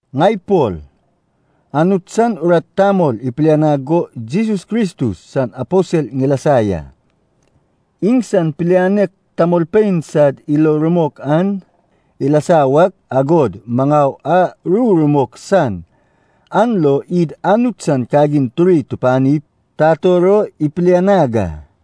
Ŋai Pol, Anut san urat tamol ipilianag go Jesus Kristus san aposel ŋilasa ya. Iŋsan pilianek tamolpein sad ilo rumok an ilasa wak, agod maŋau a ru rumok san an lo id Anut san kagin turi tupanip tator o ipilianag a.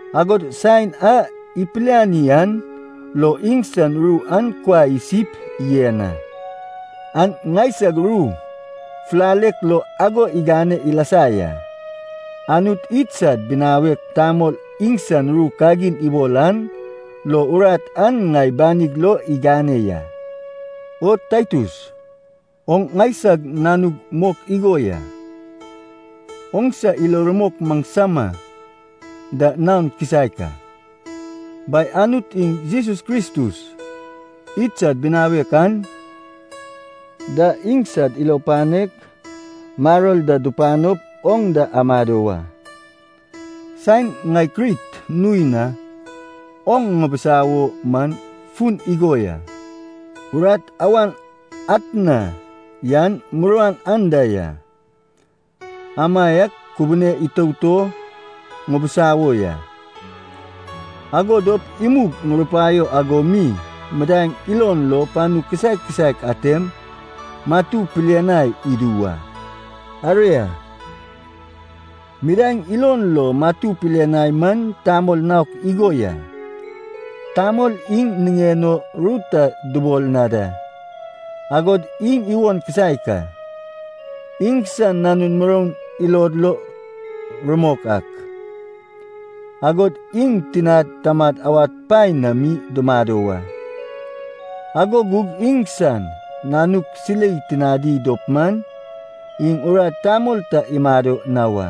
Agod saen a ipiliani an lo iŋsan ru an kuai isip yen a. An ŋaisag ru fulalek lo ago igane ilasa ya. Anut idsad binawek tamol iŋsan ru kagin ibol an lo urat an ŋai banig lo igane ya. O Taitus, oŋ ŋaisag nanug mok igo ya, oŋsa ilo rumok maŋsama da naon kisaek a. Bai Anut iŋ Jesus Kristus idsad binawek an da iŋsad ilo panek, maror da dupanop oŋ da amado wa. Saen ŋai Krit nui na oŋ ŋibisawo man fun igo ya. Urat awan atna yan muruan anda ya, amaiak kubune itout o ŋibisawo ya. Ago dop imug ŋurupaio ago mi midaeŋ ilon lo panu kisaek kisaek atem matu pilianai idu wa. Aria, midaeŋ ilon lo matu pilianai man tamol naok igo ya. Tamol iŋ niŋen o ru ta dubol na da, agod iŋ iwon kisaek a. Iŋsan nanun muroun ilod lo rumok ak, agod iŋ tinad tamad awad paen na mi dumado wa. Ago gug iŋsan nanuk silei tinadi dop man, iŋ urat tamol ta imado na wa.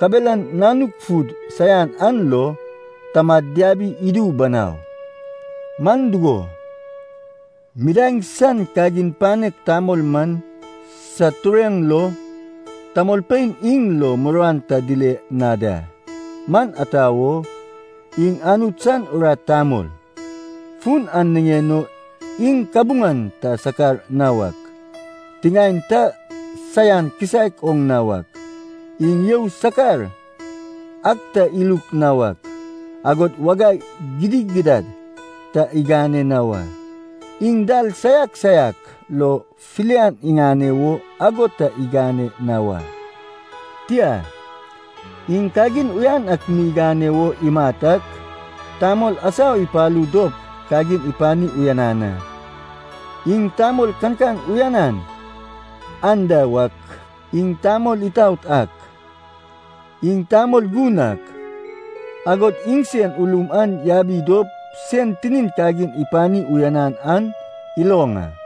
Kabelan nanuk fud saian an lo tamad diabi idu banau. Man dugo, midaeŋ san kagin panek tamol man sad tureŋ lo tamolpein iŋ lo muruan ta dile na da. Man ata wo, iŋ Anut san urat tamol. Fun an niŋen o iŋ kabuŋan ta sakar na wak, tiŋaen ta saian kisaek oŋ na wak, iŋ you sakar ak ta iluk na wak, agod wagai gidigidad ta igane na wa. Iŋ dal saiak saiak lo filian iŋane wo ago ta igane na wa. Tia, iŋ kagin uyan ak mi igane wo imat ak, tamol asau ipalu dop kagin ipani uyanan a. Iŋ tamol kankan uyanan anda wak, iŋ tamol itaot ak, iŋ tamol gun ak, agod iŋsen ulum an yabi dop sen tinin kagin ipani uyanan an iloŋ a.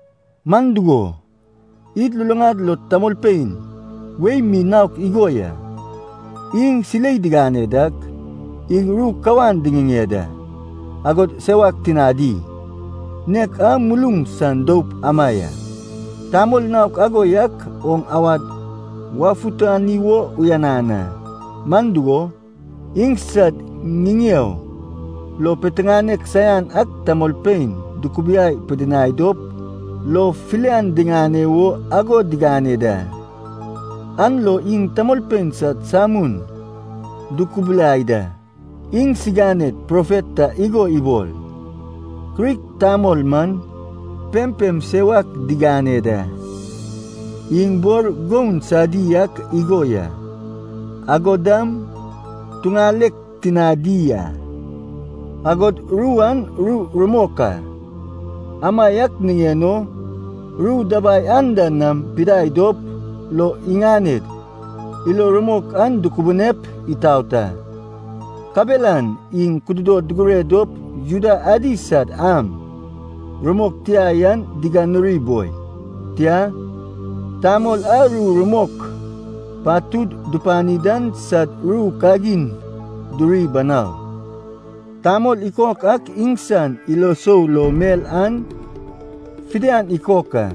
Man dugo, id luluŋad lo tamolpein wei mi naok igo ya, iŋ silei digane dak, iŋ ru kawan diŋiŋeŋ da, agod sewak tinadi, nek a muluŋ san doup ama ya. Tamol naok ago yak oŋ awad wafutani wo uyanan a. Man dugo, iŋsad ŋiŋeo lo piteŋanek saian ak tamolpein dukubiai pidinai dop lo filian diŋane wo ago digane da. An lo iŋ tamolpein sad samun dukubulai da. Iŋsiganed profet ta igo ibol, “Krit tamol man pempem sewak digane da, iŋ bor goun saiadi ak igo ya, agod dam tuŋalek tinadi a.” Agod ru an ru rumok a. Amaiak niŋen o ru dabai anda nam pidai dop lo iŋaned ilo rumok an dukubunep itaot a. Kabelan iŋ kududod dugure dop Juda adi sad am rumok tia yan diganuri boi, tia, tamol a ru rumok patud dupani dan sad ru kagin duri banau. Tamol ikok ak iŋsan ilo sou lo mel an fidian ikok a.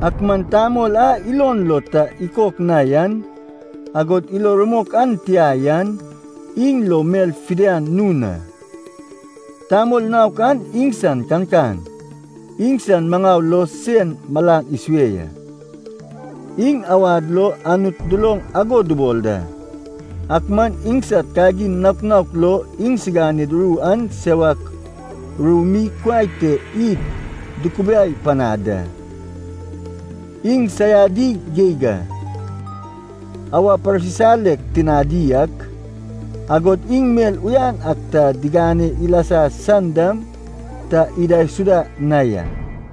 Ak man tamol a ilon lo ta ikok na yan, agod ilo rumok an tia yan, iŋ lo mel fidian nun a. Tamol naok an iŋsan kankan, iŋsan maŋau lo sen malan isue ya. Iŋ awad lo Anut duloŋ ago dubol da, ak man iŋsad kagin naok naok lo iŋsiganed ru an sewak ru mi kuai te id dukubiai panad da. Iŋ saiadi geig a. Awa parsisalek tinadi ak, agod iŋ mel uyan ak ta digane ilasa san dam ta idaisuda na ya.